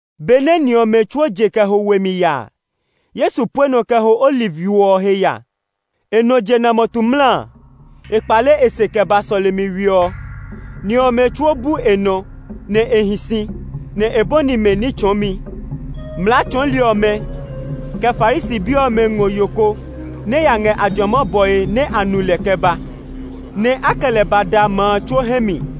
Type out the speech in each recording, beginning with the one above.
[ Benɛ ni ɔmɛ tsuo je kɛ ho we mi ya a, Yesu pue nɔ kɛ ho Oliv yo ɔ he ya. E nɔ jena mɔtu mla a, e kpale e se kɛ ba sɔlemi we ɔ. Ni ɔmɛ tsuo ba bu e nɔ, nɛ e hi si, nɛ e bɔni mɛ ní tsɔɔmi. Mlaa tsɔɔli ɔmɛ, kɛ Farisi bi ɔmɛ ngɔ yo ko nɛ ya ngɛ ajuama bɔe nɛ a nu lɛ kɛ ba, nɛ a kɛ lɛ ba da ma a tsuo hɛ mi.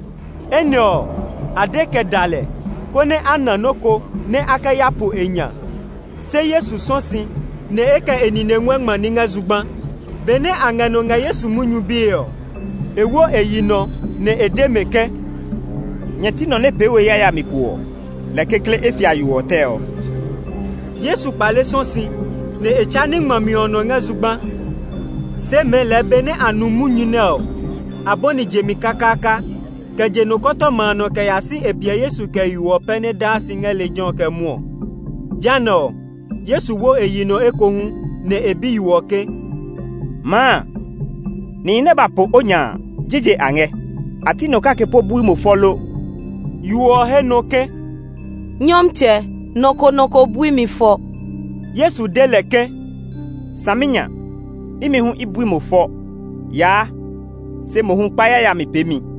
Enɛ ɔ, a de kɛ da lɛ, konɛ a na nɔ́ ko nɛ a kɛ ya po e nya. Se Yesu sɔ̃ si, nɛ e kɛ e nine nguɛ ngma ní ngɛ zugba. Benɛ a ngɛ nɔ ngɛ Yesu munyu bie ɔ, e wo e yi nɔ nɛ e de mɛ ke, “Nyɛ ti nɔ nɛ pee we yayami ko ɔ, lɛ kekle e fia yo ɔ tɛ ɔ.” Yesu kpale sɔ̃ si, nɛ e tsa ní ngmami ɔ nɔ ngɛ zugba. Se mɛɛ lɛɛ benɛ a nu munyu nɛ ɔ, a bɔni jemi kakaaka, kɛ je nɔkɔtɔma a nɔ kɛ ya si e piɛ Yesu, kɛ yo ɔ pɛ nɛ daa si ngɛ lejɛ ɔ kɛ mwɔɔ. Jehanɛ ɔ, Yesu wo e yi nɔ ekohu, nɛ e bi yo ɔ ke, “Maa, nihi nɛ ba po o nya a, jije a ngɛ? A ti nɔ kake po bui mo fɔ lo?” Yo ɔ he nɔ ke, “Nyɔmtsɛ, nɔ ko nɔ ko bui mi fɔ.” Yesu de lɛ ke, “Saminya, imi hu i bui mo fɔ. Yaa, se mohu kpa yayami peemi.”]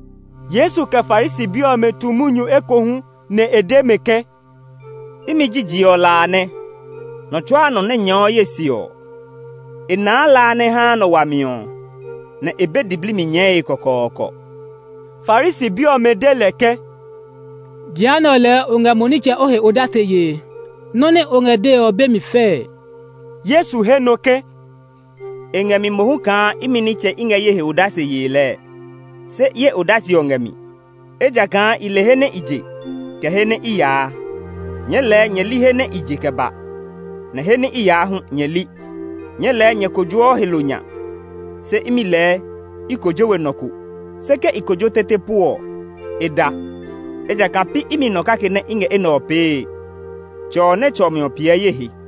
Yesu, kɛ Farisi bi ɔmɛ tu munyu ekohu, nɛ e de mɛ ke, “Imi ji je ɔ la a nɛ. Nɔ tsuaa nɔ nɛ nyɛɛɔ ye se ɔ, e naa la a nɛ haa nɔ wami ɔ; nɛ e be diblii mi nyɛɛe kɔkɔɔkɔ.” Farisi bi ɔmɛ de lɛ ke, “Jehanɛ lɛɛ o ngɛ mo nitsɛ o he odase yee. Nɔ nɛ o ngɛ dee ɔ be mi fɛɛ.” Yesu he nɔ ke, “E ngɛ mi mohu kaa imi nitsɛ i ngɛ ye he odase yee lɛɛ, se ye odase ɔ ngɛ mi, ejakaa i le he nɛ i je, kɛ he nɛ i yaa. Nyɛɛ lɛɛ nyɛ li he nɛ i je kɛ ba; nɛ he nɛ i yaa hu nyɛ li. Nyɛɛ lɛɛ nyɛ kojoɔ he lo nya, se imi lɛɛ, i kojo we nɔ ko. Se ke i kojo tete po ɔ, e da, ejakaa pi imi nɔ kake nɛ i ngɛ enɛ ɔ pee. Tsɛ ɔ nɛ tsɔ mi ɔ piɛ ye he.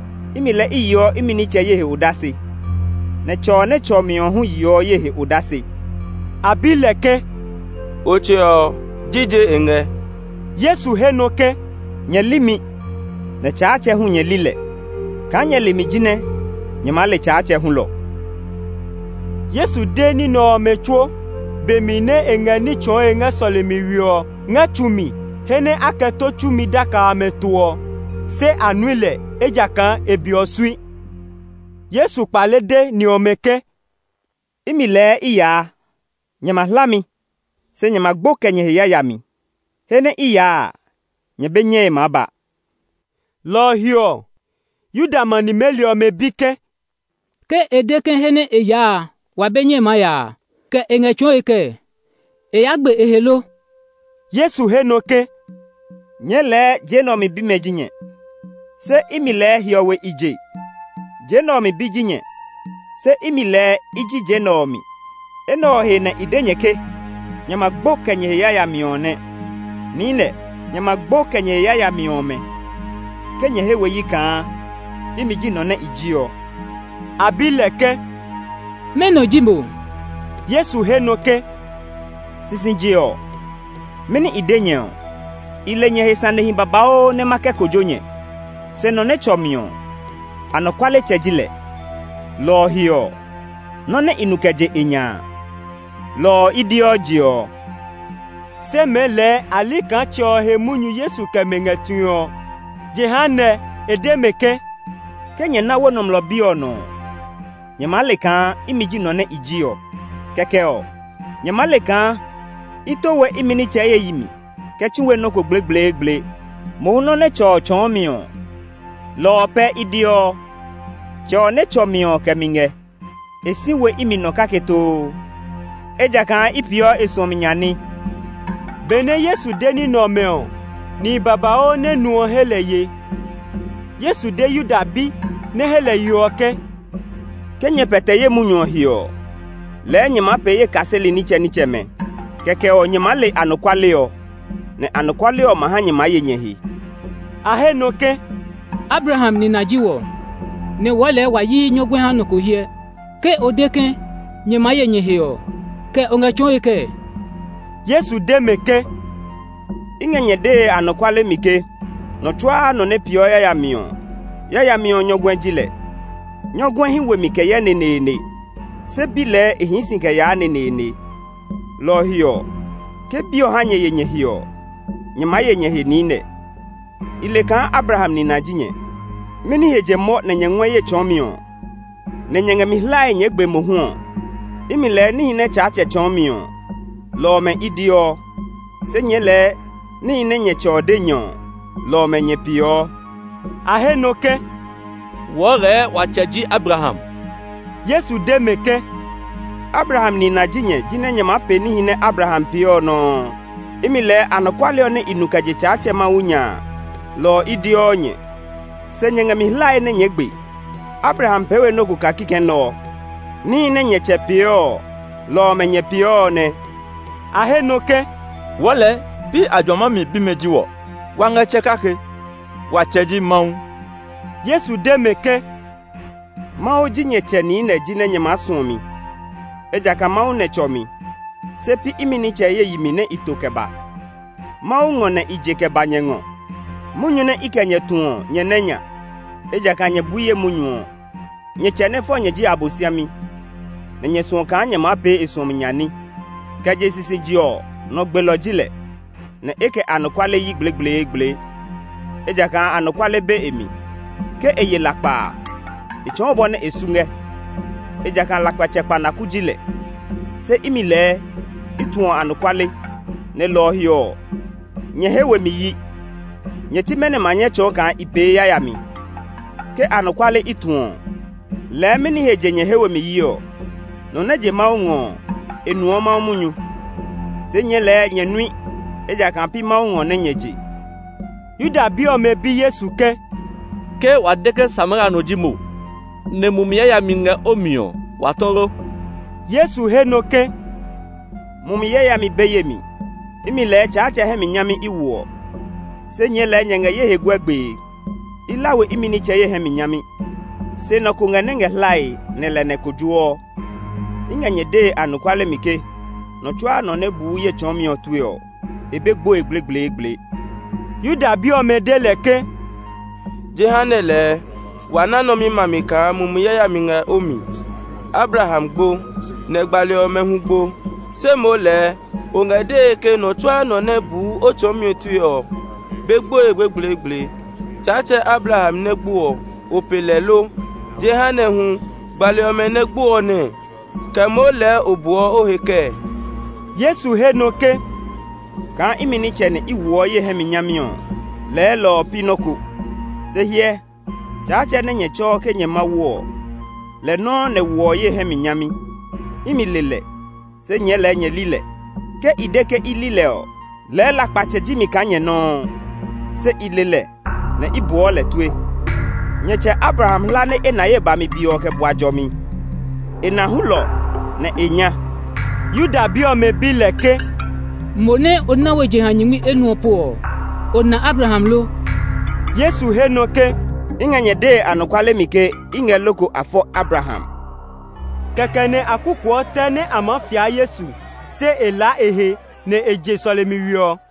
Imi lɛɛ i yeɔ imi nitsɛ ye he odase, nɛ Tsɛ ɔ nɛ tsɔ mi ɔ hu yeɔ ye he odase.” A bi lɛ ke, “O Tsɛ ɔ, jije e ngɛ?” Yesu he nɔ ke, “Nyɛ li mi, nɛ Tsaatsɛ hu nyɛ li lɛ. Kaa nyɛ le mi jinɛ nyɛ maa le Tsaatsɛ hulɔ.” Yesu de ní nɛ ɔmɛ tsuo, be mi nɛ e ngɛ ní tsɔɔe ngɛ sɔlemi we ɔ ngɛ tsu mi he nɛ a kɛ tó tsumi daka amɛ to ɔ. Se a nui lɛ, ejakaa e be ɔ sui. Yesu kpale de ni ɔmɛ ke, “Imi lɛɛ i yaa! Nyɛ ma hla mi, se nyɛ ma gbo kɛ nyɛ he yayami. He nɛ i yaa a, nyɛ be nyɛe maa ba.” Lɔ ɔ he ɔ, Yuda ma nimeli ɔmɛ bi ke, “Ke e de ke he nɛ e yaa a, wa be nyɛe maa ya a, kɛ e ngɛ tsɔɔe kɛɛ? E yaa gbe e he lo?” Yesu he nɔ ke, “Nyɛɛ lɛɛ je nɛ ɔ mi bi ji nyɛ; se imi lɛɛ hiɔwe i je. Je nɛ ɔ mi bi ji nyɛ, se imi lɛɛ i ji je nɛ ɔ mi. Enɛ ɔ he nɛ i de nyɛ ke nyɛ ma gbo kɛ nyɛ he yayami ɔ nɛ. Niinɛ, nyɛ ma gbo kɛ nyɛ he yayami ɔmɛ ke nyɛ he we yi kaa imi ji nɔ nɛ i ji ɔ.” A bi lɛ ke, “Mɛnɔ ji mo?” Yesu he nɔ ke, “Sisije ɔ, mɛni i de nyɛ ɔ? I le nyɛ he sanehi babauu nɛ ma kɛ kojo nyɛ. Se nɔ nɛ tsɔ mi ɔ, anɔkualetsɛ ji lɛ, lɔ ɔ he ɔ, nɔ nɛ i nu kɛ je e nya a, lɔ ɔ i deɔ je ɔ.” Se mɛɛ lɛɛ a li kaa Tsɛ ɔ he munyu Yesu kɛ mɛ ngɛ tue ɔ. Jehanɛ e de mɛ ke, “Ke nyɛ ná wo Nɔmlɔ Bi ɔ nɔ ɔ, nyɛ maa le kaa imi ji nɔ nɛ i ji ɔ. Kɛkɛ ɔ, nyɛ maa le kaa i to we imi nitsɛ ye yi mi kɛ tsu we nɔ́ ko gblegbleegble. Mohu nɔ́ nɛ Tsɛ ɔ tsɔɔ mi ɔ, lɔ ɔ pɛ i deɔ. Tsɛ ɔ nɛ tsɔ mi ɔ kɛ mi ngɛ; e si we imi nɔ kake too, ejakaa i peeɔ e suɔmi nya ní.” Benɛ Yesu de ní nɛ ɔmɛ ɔ, nihi babauu nɛ nu ɔ he lɛ ye. Yesu de Yuda bi nɛ he lɛ ye ɔ ke, “Ke nyɛ pɛtɛ ye munyu ɔ he ɔ, lɛɛ nyɛ maa pee ye kaseli nitsɛnitsɛmɛ. Kɛkɛ ɔ, nyɛ maa le anɔkuale ɔ; nɛ anɔkuale ɔ ma ha nyɛ maa ye nyɛ he.” A he nɔ ke, “Abraham nina ji wɔ, nɛ wɔɔ lɛɛ wa yi nyɔguɛ ha nɔ ko hyɛ. Ke o de ke, ‘Nyɛ maa ye nyɛ he’ ɔ, kɛ o ngɛ tsɔɔe kɛɛ?” Yesu de mɛ ke, “I ngɛ nyɛ dee anɔkuale mi ke nɔ tsuaa nɔ nɛ peeɔ yayami ɔ, yayami ɔ nyɔguɛ ji lɛ. Nyɔguɛ hí we mi kɛ yɛ neneene, se bi lɛɛ e hii si kɛ yaa neneene. Lɔ ɔ he ɔ, ke Bi ɔ ha nyɛ ye nyɛ he ɔ, nyɛ maa ye nyɛ he niinɛ. I le kaa Abraham nina ji nyɛ! Mɛni he je mɔ nɛ nyɛ ngɔɛ ye tsɔɔmi ɔ, nɛ nyɛ ngɛ mi hlae nyɛɛ gbe mohu ɔ. Imi lɛɛ níhi nɛ Tsaatsɛ tsɔɔ mi ɔ, lɔ ɔmɛ i deɔ; se nyɛɛ lɛɛ níhi nɛ nyɛ tsɛ ɔ de nyɛ ɔ, lɔ ɔmɛ nyɛ peeɔ.” A he nɔ ke, “Wɔɔ lɛɛ wa tsɛ ji Abraham.” Yesu de mɛ ke, “Abraham nina ji nyɛ jinɛ nyɛ maa pee níhi nɛ Abraham pee ɔ nɔuu. Imi lɛɛ anɔkuale ɔ nɛ i nu kɛ je Tsaatsɛ Mawu nya a, lɔ ɔ i deɔ nyɛ; se nyɛ ngɛ mi hlae nɛ nyɛɛ gbe. Abraham pee we nɔ́ ko kaa kikɛ nɛ ɔ. Níhi nɛ nyɛ tsɛ peeɔ ɔ, lɔ ɔmɛ ngɛ peeɔ ɔ nɛ.” A he nɔ ke, “Wɔɔ lɛɛ pi ajuama mi bimɛ ji wɔ. Wa ngɛ tsɛ kake. Wa tsɛ ji Mawu.” Yesu de mɛ ke, “Mawu ji nyɛ Tsɛ niinɛ jinɛ nyɛ maa suɔ mi, ejakaa Mawu nɛ tsɔ mi; se pi imi nitsɛ ye yi mi nɛ i to kɛ ba. Mawu ngɔ nɛ i je kɛ ba nyɛ ngɔ. Munyu nɛ i kɛ nyɛ tu ɔ, nyɛ nɛ nya, ejakaa nyɛ bui ye munyu ɔ. Nyɛ tsɛ nɛ fɔ nyɛ ji Abosiami; nɛ nyɛ suɔ kaa nyɛ maa pee e suɔmi nya ní. Kɛ je sisije ɔ, nɔ gbelɔ ji lɛ, nɛ e kɛ anɔkuale yi gblegbleegble, ejakaa anɔkuale be e mi. Ke e ye lakpa a, e tsɔɔ bɔ nɛ e su ngɛ, ejakaa lakpatsɛ kpanaku ji lɛ. Se imi lɛɛ, i tuɔ anɔkuale; nɛ lɔ ɔ he ɔ, nyɛ he we mi yi. Nyɛ ti mɛnɔ ma nyɛ tsɔɔ kaa i pee yayami. Ke anɔkuale i tuɔ ɔ, lɛɛ mɛni he je nyɛ he we mi yi ɔ? Nɔ nɛ je Mawu ngɔ ɔ, e nuɔ Mawu munyu. Se nyɛɛ lɛɛ nyɛ nui, ejakaa pi Mawu ngɔ nɛ nyɛ je.” Yuda bi ɔmɛ bi Yesu ke, “Ke wa de ke Samaria no ji mo, nɛ mumi yayami ngɛ o mi ɔ, wa tɔ lo?” Yesu he nɔ ke, “Mumi yayami be ye mi. Imi lɛɛ Tsaatsɛ hɛ mi nyami i woɔ, se nyɛɛ lɛɛ nyɛ ngɛ ye he guɛ gbee. I hla we imi nitsɛ ye hɛ mi nyami. Se nɔ ko ngɛ nɛ ngɛ hlae, nɛ lɛ nɛ maa kojo. I ngɛ nyɛ dee anɔkuale mi ke nɔ tsuaa nɔ nɛ buu ye tsɔɔmi ɔ tue ɔ, e be gboe gblegbleegble.” Yuda bi ɔmɛ de lɛ ke, “Jehanɛ lɛɛ wa ná nɔ mi mami kaa mumi yayami ngɛ o mi. Abraham gbo, nɛ gbali ɔmɛ hu gbo, se moo lɛɛ o ngɛ dee ke nɔ tsuaa nɔ nɛ buu o tsɔɔmi tue ɔ be gboe gblegbleegble. Tsaatsɛ Abraham nɛ gbo ɔ, o pe lɛ lo? Jehanɛ ɔ hu, gbali ɔmɛ nɛ gbo ɔ nɛɛ? Kɛ moo lɛɛ o buɔ o he kɛɛ?” Yesu he nɔ ke, “Kaa imi nitsɛ nɛ i woɔ ye hɛ mi nyami ɔ, lɛɛ lɔ ɔ pi nɔ́ ko; se hyɛ, Tsaatsɛ nɛ nyɛ tsɛɔ ke nyɛ Mawu ɔ, lɛ nɔuu nɛ woɔ ye hɛ mi nyami. Imi le lɛ, se nyɛɛ lɛɛ nyɛ li lɛ. Ke i de ke i li lɛ ɔ, lɛɛ lakpatsɛ ji mi kaa nyɛ nɔuu. Se i le lɛ, nɛ i buɔ lɛ tue. Nyɛ tsɛ Abraham hla nɛ e na ye bami be ɔ kɛ bua jɔmi. E na hulɔ, nɛ e nya.” Yuda bi ɔmɛ bi lɛ ke, “Mo nɛ o na we jeha nyingmi enuɔ po ɔ, o na Abraham lo?” Yesu he nɔ ke, “I ngɛ nyɛ dee anɔkuale mi ke i ngɛ loko a fɔ Abraham.” Kɛkɛ nɛ a kukuɔ tɛ nɛ a maa fia Yesu, se e laa e he, nɛ e je sɔlemi we ɔ.